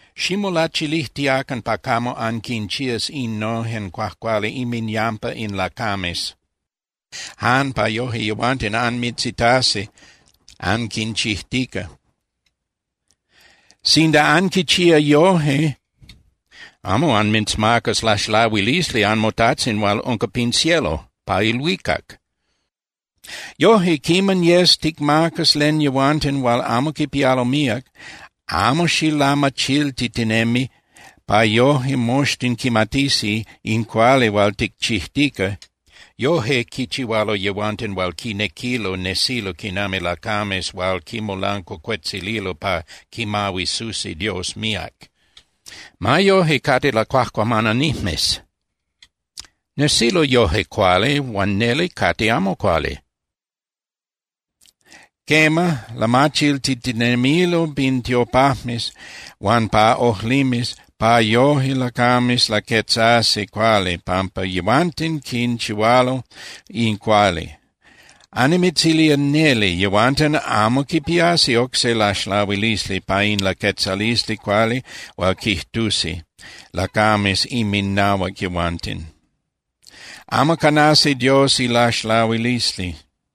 ’Ximolachilijtiacan pa camo anquinchías innojen cuajcuali inminyampa in lacames jan pa yoje yehuanten anmitzitasi anquinchijtica. Sinda anquichía yoje, amo anmitzmacas laxlahuilisli anmoTajtzin hual unca pin cielo (pa ilhuicac). Yoje, quiman yes ticmacas len yehuanten hual amo quipialo míac, amo xilamachiltitinemi pa yoje moxtin quimatisi in cuali hual ticchijtica. Yoje quichihualo yehuanten hual quinequilo nesilo quinami lacames hual quimolancuacuetzililo pa quimahuisusi Dios míac. Ma yoje cate lacuajcuamananijmes. Nesilo yoje cuali huan neli cate amo cuali. Quema, lamachiltitinemilo pin tiopajmes huan pa ojlimes pa yoje lacames laquetzasi cuali pampa yehuanten quinchihualo in cuali. Annimitzilía neli, yehuanten amo quipiasi oc se laxlahuilisli pa in laquetzalisli cuali hual quijtusi lacames inminahuac yehuanten. Amo canasi Dios ilaxlahuilisli.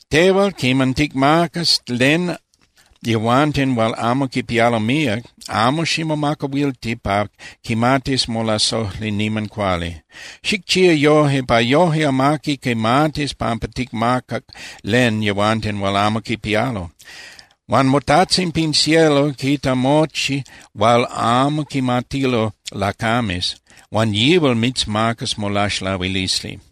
Tehual quiman ticmacas len yehuanten hual amo quipialo míac, amo ximomacahuilti pa quimatis molasojli niman cuali. Xicchía yoje pa yoje amaqui quimatis pampa ticmacac len yehuanten hual amo quipialo. Huan moTajtzin pin cielo quita mochi hual amo quimatilo lacames, huan yihual mitzmacas molaxlahuilisli.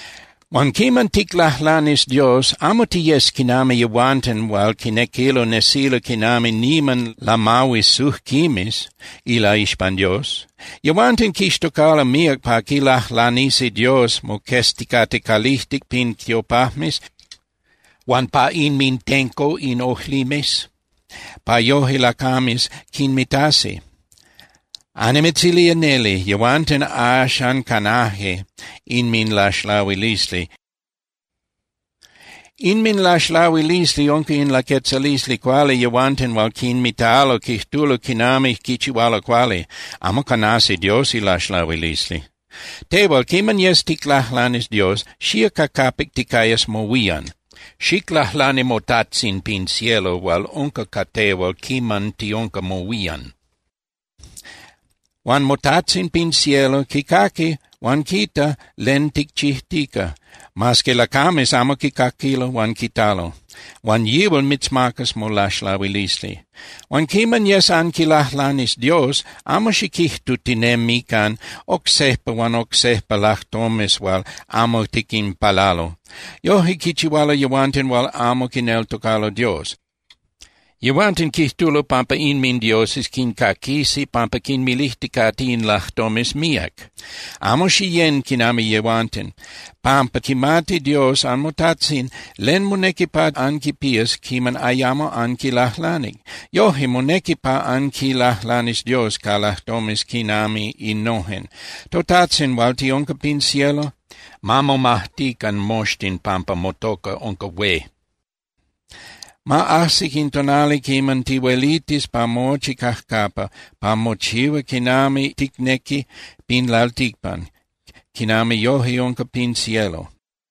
’Huan quiman ticlajlanis Dios, amo tiyes quinami yehuanten hual quinequilo nesilo quinami niman lamahuisujquimes ilaixpan Dios. Yehuanten quixtocalo míac pa quilajlanisi Dios moquezticate calijtic pin tiopajmes huan pa inmintenco in ojlimes, pa yoje lacames quinmitasi. Annimitzilía neli, yehuanten axan canaje inminlaxlahuilisli. Inminlaxlahuilisli unca in laquetzalisli cuali yehuanten hual quinmitalo quijtulo quiman quichihualo cuali. Amo canasi Dios ilaxlahuilisli. Tehual, quiman yes ticlajlanis Dios, xía ca capic ticayas mohuían. Xiclajlani moTajtzin pin cielo hual unca ca tehual quiman tiunca mohuían. Huan moTajtzin pin cielo quicaqui huan quita len ticchijtica, mas que lacames amo quicaquilo huan quitalo. Huan yihual mitzmacas molaxlahuilisli. ’Huan quiman yes anquilajlanis Dios, amo xiquijtutinemican oc sejpa huan oc sejpa lajtomes hual amo tiquinpalalo. Yoje quichihualo yehuanten hual amo quineltocalo Dios. Yehuanten quijtulo pampa inmindioses quincaquisi pampa quinmilijticate in lajtomes míac. Amo xiyén quinami yehuanten, pampa quimati Dios anmoTajtzin len monequi pa anquipías quiman ayamo anquilajlanic. Yoje, monequi pa anquilajlanis Dios ca lajtomes quinami innojen: ToTajtzin hual tiunca pin cielo, ma momajtican moxtin pampa motoca unca hué. Ma ajsi in tonali quiman tihuelitis pa mochi cajcapa, ma mochihua quinami ticnequi pin lalticpan, quinami yoje unca pin cielo.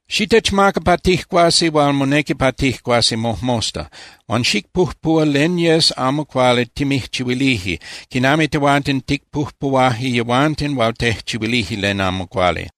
Xitechmaca pa tijcuasi hual monequi pa tijcuasi mojmosta. Huan xicpujpuhua len yes amo cuali timijchihuilije, quiman tehuanten ticpujpuhuaje yehuanten hual tejchihuilije len amo cuali.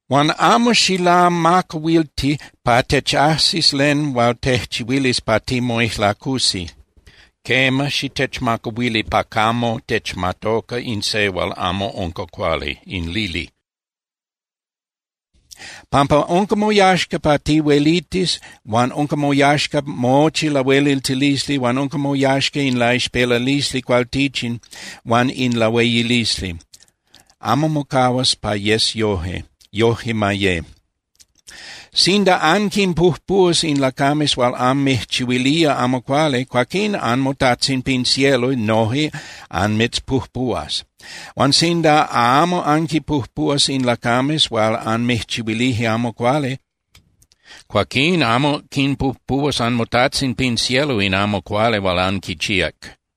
Huan amo xilamacahuilti pa techajsis len hual tejchihuilis pa timoijlacusi. Quema, xitechmacahuili pa camo techmatoca in se hual amo unca cuali, in lili, pampa unca moyaxca pa tihuelitis huan unca moyaxca mochi lahueliltilisli, huan unca moyaxca in laixpelalisli cualtichin huan in lahueyilisli. Amo mocahuas pa yes yoje. Yojque ma ye. ’Sinda anquinpujpuhuas in lacames hual anmijchihuilije amo cuali, cuaquín anmoTajtzin pin cielo noje anmitzpujpuhuas. Huan sinda amo anquinpujpuhuas in lacames hual anmijchihuilije amo cuali, cuaquín amo quinpujpuhuas anmoTajtzin pin cielo in amo cuali hual anquichíac.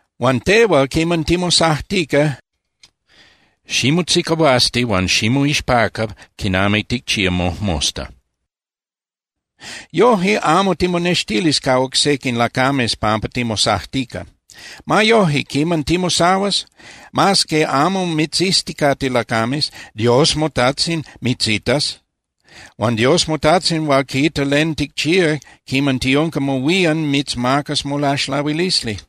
Huan tehual, quiman timosajtica, ximotzicahuasti huan ximoixpaca quinami ticchía mojmosta. Yoje amo timonextilis ca oc sequin lacames pampa timosajtica. Ma yoje, quiman timosahuas, mas que amo mitzizticate lacames, Dios moTajtzin mitzitas. Huan Dios moTajtzin hual quita len ticchía quiman tiunca mohuían mitzmacas molaxlahuilisli.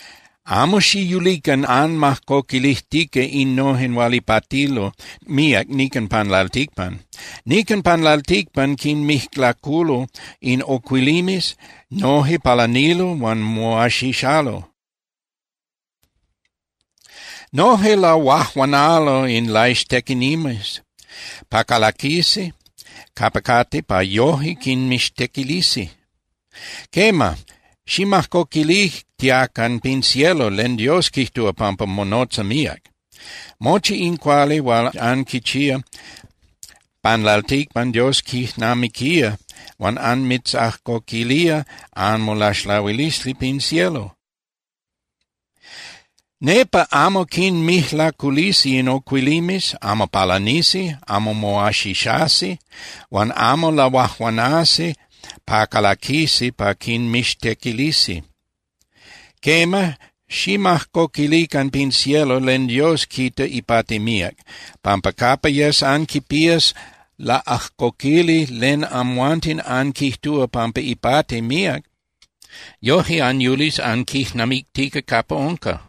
’Amo xiyulican anmajcoquilijtica innojen hual ipatilo míac nican pan lalticpan. Nican pan lalticpan quinmijlaculo in ocuilimes, noje palanilo huan moaxixalo. Noje lahuajuanalo in laixtequinijmes pa calaquisi capa cate pa yoje quinmixtequilisi. Quema, ximajcoquilijtiacan pin cielo len Dios quijtúa pampa monotza míac. Mochi in cuali hual anquichía pan lalticpan Dios quijnamiquía huan anmitzajcoquilía anmolaxlahuilisli pin cielo. Nepa amo quinmijlaculisi in ocuilimes, amo palanisi, amo moaxixasi, huan amo lahuajuanasi pa calaquisi pa quinmixtequilisi. Quema, ximajcoquilican pin cielo len Dios quita ipati míac, pampa capa yes anquipías laꞌajcoquili len amhuanten anquijtúa pampa ipati míac, yoje anyulis anquijnamictica capa unca.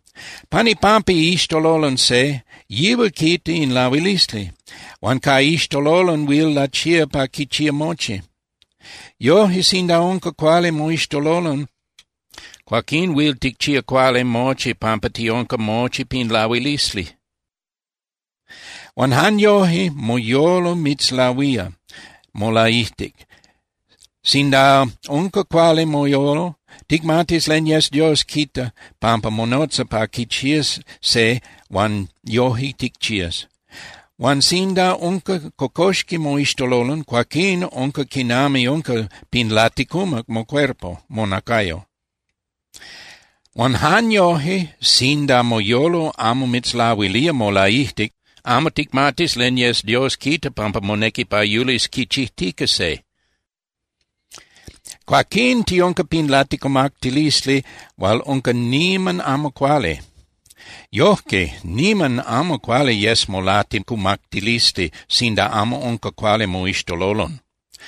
’Pan ipampa iixtololon se, yihual quita in lahuilisli, huan ca iixtololon huil lachía pa quichía mochi. Yoje, sinda unca cuali moixtololon, cuaquín huil ticchía cuali mochi pampa tiunca mochi pin lahuilisli. Huan jan yoje moyolo mitzlahuía molaijtic. Sinda unca cuali moyolo, ticmatis len yes Dios quita pampa monotza pa quichías se huan yoje ticchías. Huan sinda unca cocoxqui moixtololon, cuaquín unca quinami unca pin laticumac mocuerpo (monacayo). Huan jan yoje sinda moyolo amo mitzlahuilía molaijtic, amo ticmatis len yes Dios quita pampa monequi pa yulis quichijtica se. Cuaquín tiunca pin laticumactilisli hual unca niman amo cuali. Yojque, ¡niman amo cuali yes molaticumactilisli sinda amo unca cuali moixtololon!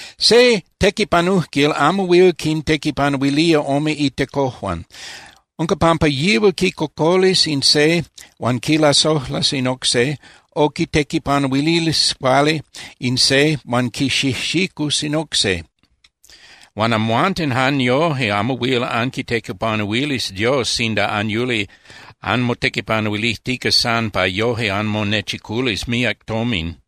’Se tequipanujquil amo huil quintequipanuilía ome itecojuan. Unca pampa yihual quicocolis in se huan quilasojlas in oc se, o quitequipanuilis cuali in se huan quixijxicus in oc se. Huan amhuanten jan yoje amo huil anquitequipanuilis Dios sinda anyuli anmotequipanuilijtica san pa yoje anmonechiculis míac tomin.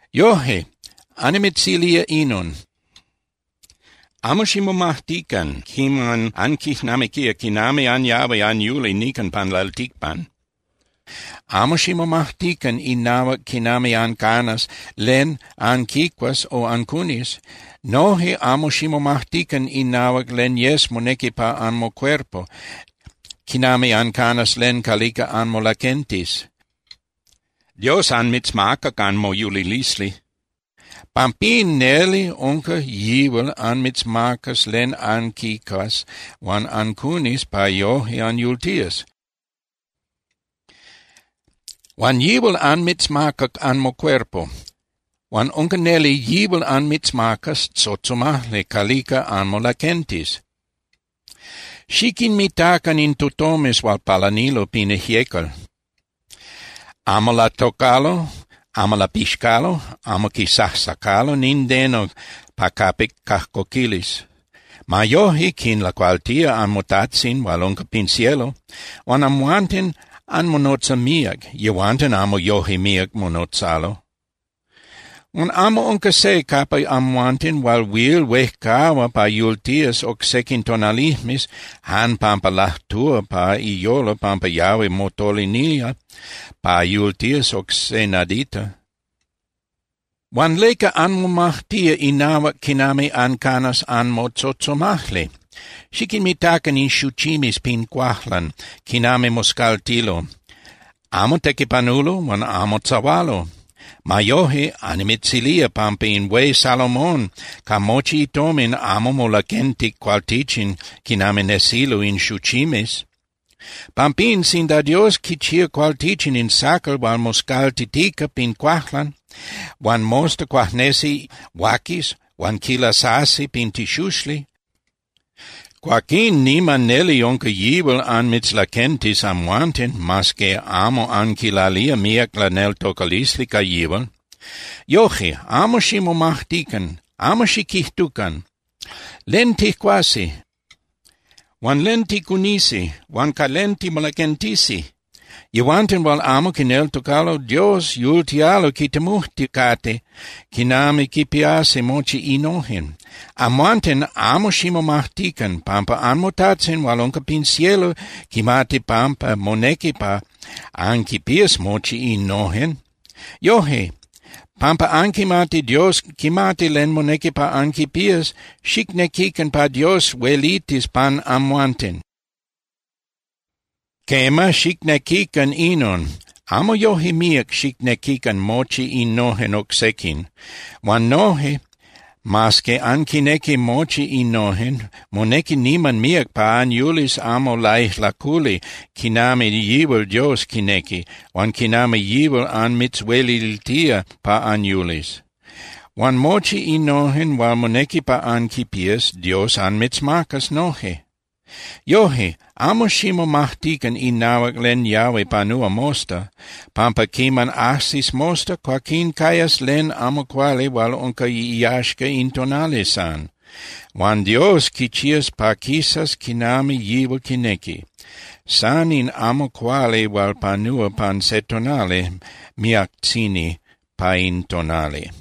’Yoje, annimitzilía inon: Amo ximomajtican quiman anquijnamiquía quinami anyahui anyuli nican pan lalticpan. Amo ximomajtican inahuac quinami ancanas len anquicuas o ancunis. Noje amo ximomajtican inahuac len yes monequi pa anmocuerpo, quinami ancanas len calica anmolaquentis. Dios anmitzmacac anmoyulilisli. Pampín neli unca yihual anmitzmacas len anquicuas huan ancunis pa yoje anyultías. Huan yihual anmitzmacac anmocuerpo, huan unca neli yihual anmitzmacas tzotzomajli calica anmolaquentis. Xiquinmitacan in tutomes hual palanilo pin ijyecal. Amo latocalo, amo lapixcalo, amo quisajsacalo nindeno pa capic cajcoquilis. Ma yoje quinlacualtía anmoTajtzin hual unca pin cielo. Huan amhuanten anmonotza míac. Yehuanten amo yoje míac monotzalo. Huan amo unca se capa amhuanten hual huil huejcahua pa yultías oc sequin tonalijmes jan pampa lajtúa pa iyolo pampa yahui motolinía pa yultías oc se nadita. Huan ¿leca anmomajtía inahuac quinami ancanas anmotzotzomajli? Xiquinmitacan in xuchimes pin cuajlan quinami moscaltilo. Amo tequipanulo huan amo tzahualo. Ma yoje, annimitzilía pampa in hué Salomón ca mochi itomin amo molaquentic cualtichin quinami nesilo in xuchimes. Pampín, sinda Dios quichía cualtichin in sacal hual moscaltitica pin cuajlan, huan mosta cuajnesi huaquis huan quilasasi pin tixuxli, cuaquín niman neli unca yihual anmitzlaquentis amhuanten, mas que amo anquilalía míac laneltocalisli ca yihual. ’Yoje, amo ximomajtican, amo xiquijtucan: “¿Len tijcuasi? Huan ¿len ticunisi? Huan ¿ca len timolaquentisi?” Yehuanten hual amo quineltocalo Dios yultialo quitemujticate quinami quipiasi mochi innojen. Amhuanten, amo ximomajtican, pampa anmoTajtzin hual unca pin cielo quimati pampa monequi pa anquipías mochi innojen. Yoje, pampa anquimati Dios quimati len monequi pa anquipías, xicnequican pa Dios huelitis pan amhuanten. Quema, xicnequican inon, amo yoje míac xicnequican mochi innojen oc sequin. Huan noje, mas que anquinequi mochi innojen, monequi niman míac pa anyulis amo laijlaculi quinami yihual Dios quinequi huan quinami yihual anmitzhueliltía pa anyulis. Huan mochi innojen hual monequi pa anquipías, Dios anmitzmacas noje. Yoje, amo ximomajtican inahuac len yahui panúa mosta, pampa quiman ajsis mosta, cuaquín cayas len amo cuali hual unca iyaxca in tonali san. Huan Dios quichías pa quisas quinami yihual quinequi. San in amo cuali hual panúa pan se tonali miactzini pa in tonali.